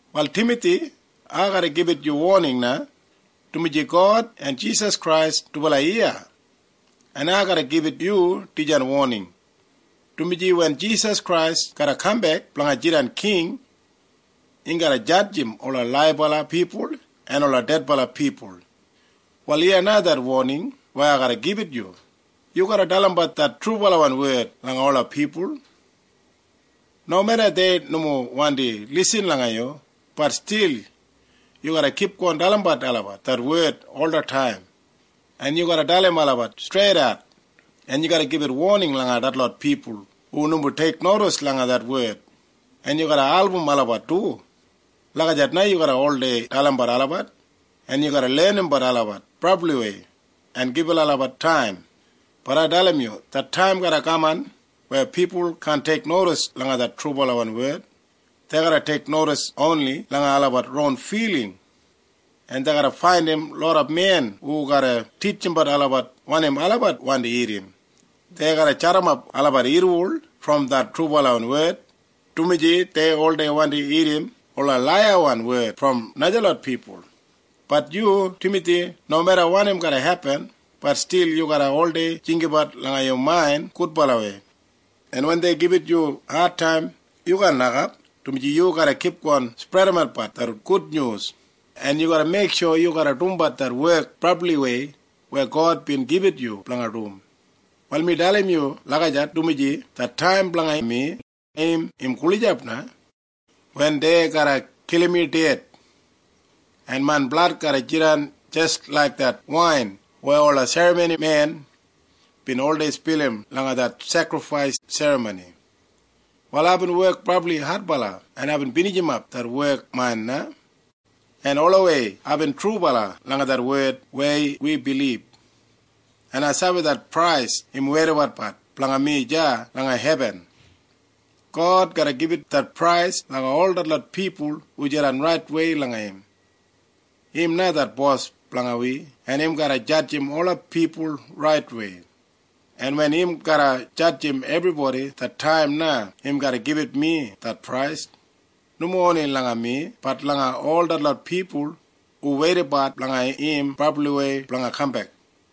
Wal Timathi, ai garra gibit yu woning na, dumaji God en Jisas Krais dubala iya. En ai garra gibit yu dijan woning, dumaji wen Jisas Krais garra kambek blanga jidan king, im garra jadjim ola laibala pipul en ola dedbala pipul. Wal iya na det woning weya ai garra gibit yu. Yu garra dalimbat det trubalawan wed langa ola pipul. Nomeda dei nomo wandi lisin langa yu, bat stil yu garra kipgon dalimbat olabat det wed olataim, en yu garra dalim olabat streidat, en yu garra gibit woning langa detlot pipul hu nomo teiknodis langa det wed, en yu garra album olabat du. Lagijat na yu garra oldei dalimbat olabat, en yu garra lenimbat olabat brabliwei en gibit olabat taim. Bat ai dalim yu. Det taim garra kaman weya pipul kaan teiknodis langa det trubalawan wed. Dei garra teiknodis oni langa olabat ron filing, en dei garra faindim loda men hu garra titjimbat olabat wanim olabat wandi irrim. Dei garra jadimap olabat irriwol brom det trubalawan wed, dumaji dei oldei wandi irrim ola laiyawan wed brom najalot pipul. Bat yu, Timathi, nomeda wanim garra hepin, bat stil yu garra oldei jinggabat langa yu main gudbalawei, en wen dei gibit yu adtaim, yu kaan nokap, dumaji yu garra kipgon spredimatbat det gudnyus, en yu garra meiksho yu dumbat det wek brabliwei weya God bin gibit yu blanga dum. Wal mi dalim yu lagijat dumaji det taim blanga mi im gulijap na, wen dei garra kilim mi ded, en main blad garra jidan jis laik det wain weya ola serramonimen bin oldei spilim langa det sekrifais serramoni. Wal aibin wek brabli adbala, en aibin binijimap det wek main na, en olawei aibin trubala langa det wed weya wi bilib, en ai sabi det prais im weidabat blanga mi deya langa hebin. God garra gibit det prais langa ol detlot pipul hu jidan raitwei langa im. Im na det Bos blanga wi, en im garra jadjim ola pipul raitwei, en wen im garra jadjim ebribodi, det taim na im garra gibit mi det prais. Nomo oni langa mi, bat langa ol detlot pipul hu weidabat blanga im brabliwei blanga kambek.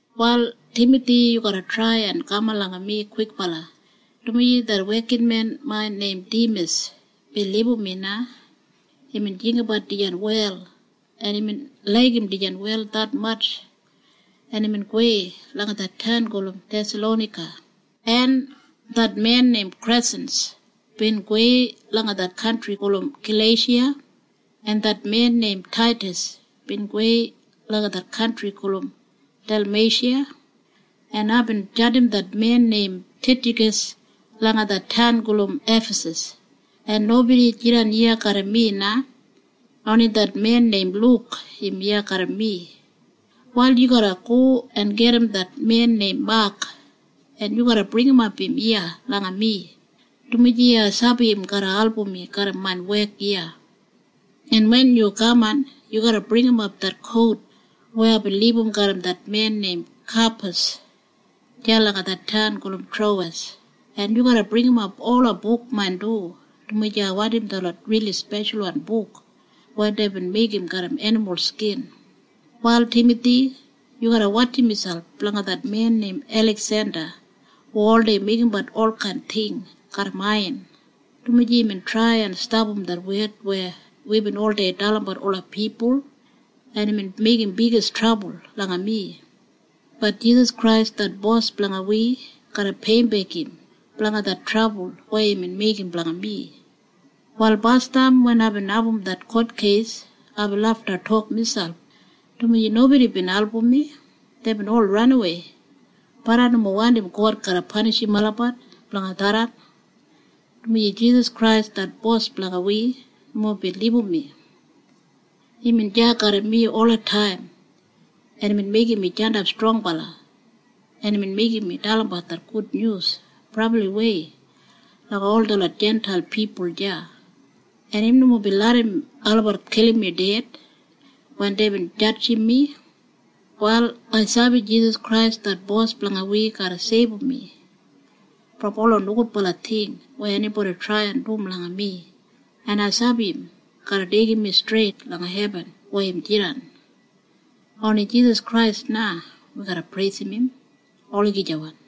Wal Timathi, yu garra trai en kaman langa mi kwikbala, dumaji det wekinmen main neim Dimas bin libum mi na. Imbin jinggabat dijan wel, en imbin laigim dijan wel detmatj, en imbin gowei langa det taun gulum Thesalonaika. En det men neim Kresins bin gowei langa det kantri gulum Galeisha, en det men neim Taidas bin gowei langa det kantri gulum Delmeisha, en aibin jandim det men neim Titjakas langa det taun gulum Efasas, en nobodi jidan iya garram mi na. Oni det men neim Luk im iya garram mi. Wal yu garra go en gedim det men neim Mak, en yu garra bringimap im iya langa mi, dumaji ai sabi im garra album mi garram main wek iya. En wen yu kaman, yu garra bringimap det kout weya aibin libum garram det men neim Kapas deya langa det taun gulum Trowes, en yu garra bringimap ola buk main du, dumaji ai wandim detlot rili speshalwan buk weya deibin meigim garram enimul skin. Wal Timathi, yu garra wotjim miselp blanga det men neim Eliksenda hu oldei meigimbat olkain ting garram aiyan, dumaji imbin trai en stapam det wed weya wibin oldei dalimbat ola pipul, en imbin meigim bigis trabul blanga mi. Bat Jisas Krais det Bos blanga wi garra peiyimbek im blanga det trabul weya imbin meigim blanga mi. Wal basdam wen aibin abum det kotkeis, aibin lafta tok miselp, dumaji nobodi bin album mi. Deibin ol ranawei. Bat ai nomo wandim God garra panishim olabat blanga tharran, dumaji Jisas Krais det Bos blanga wi nomo bin libum mi. Imbin deya garram mi olataim, en imbin meigim mi jandap strongbala, en imbin meigim mi dalimbat det gudnyus brabliwei langa ol detlot Jintail pipul deya, en im nomo bin larram olabat kilim mi ded wen deibin jadjim mi. Wal ai sabi Jisas Krais det Bos blanga wi garra seibum mi brom ola nogudbala ting weya enibodi trai en dum langa mi, en ai sabi im garra deigim mi streit langa hebin weya im jidan. Oni Jisas Krais na wi garra preisim im. Olagijawan.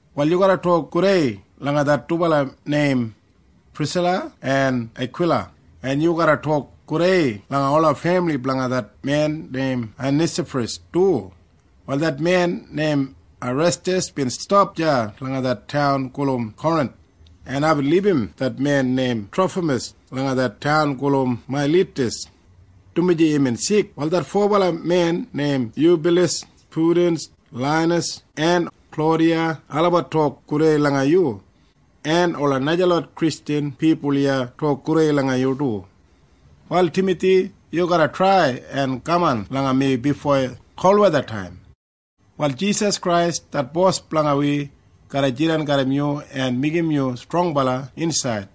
Wal yu garra tok gudei langa det dubala neim Prisila en Akwila, en yu garra tok gudei langa ola femili blanga det men neim Onesafras du. Wal det men neim Irestas bin stap deya langa det taun gulum Korinth, en aibin libum det men neim Trofamas langa det taun gulum Mailitas, dumaji imbin sik. Wal det fobala men neim Yubyulas, Pudins, Lainas en Klaudiya olabat tok gudei langa yu, en ola najalot Kristjan pipul iya tok gudei langa yu du. Wal Timathi, yu garra trai en kaman langa mi bifo kolwethataim. Wal Jisas Krais det Bos blanga wi garra jidan garram yu en meigim yu strongbala insaid,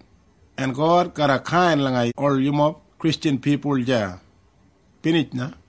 en God garra kain langa ol yumob Kristjan pipul deya. Binij na.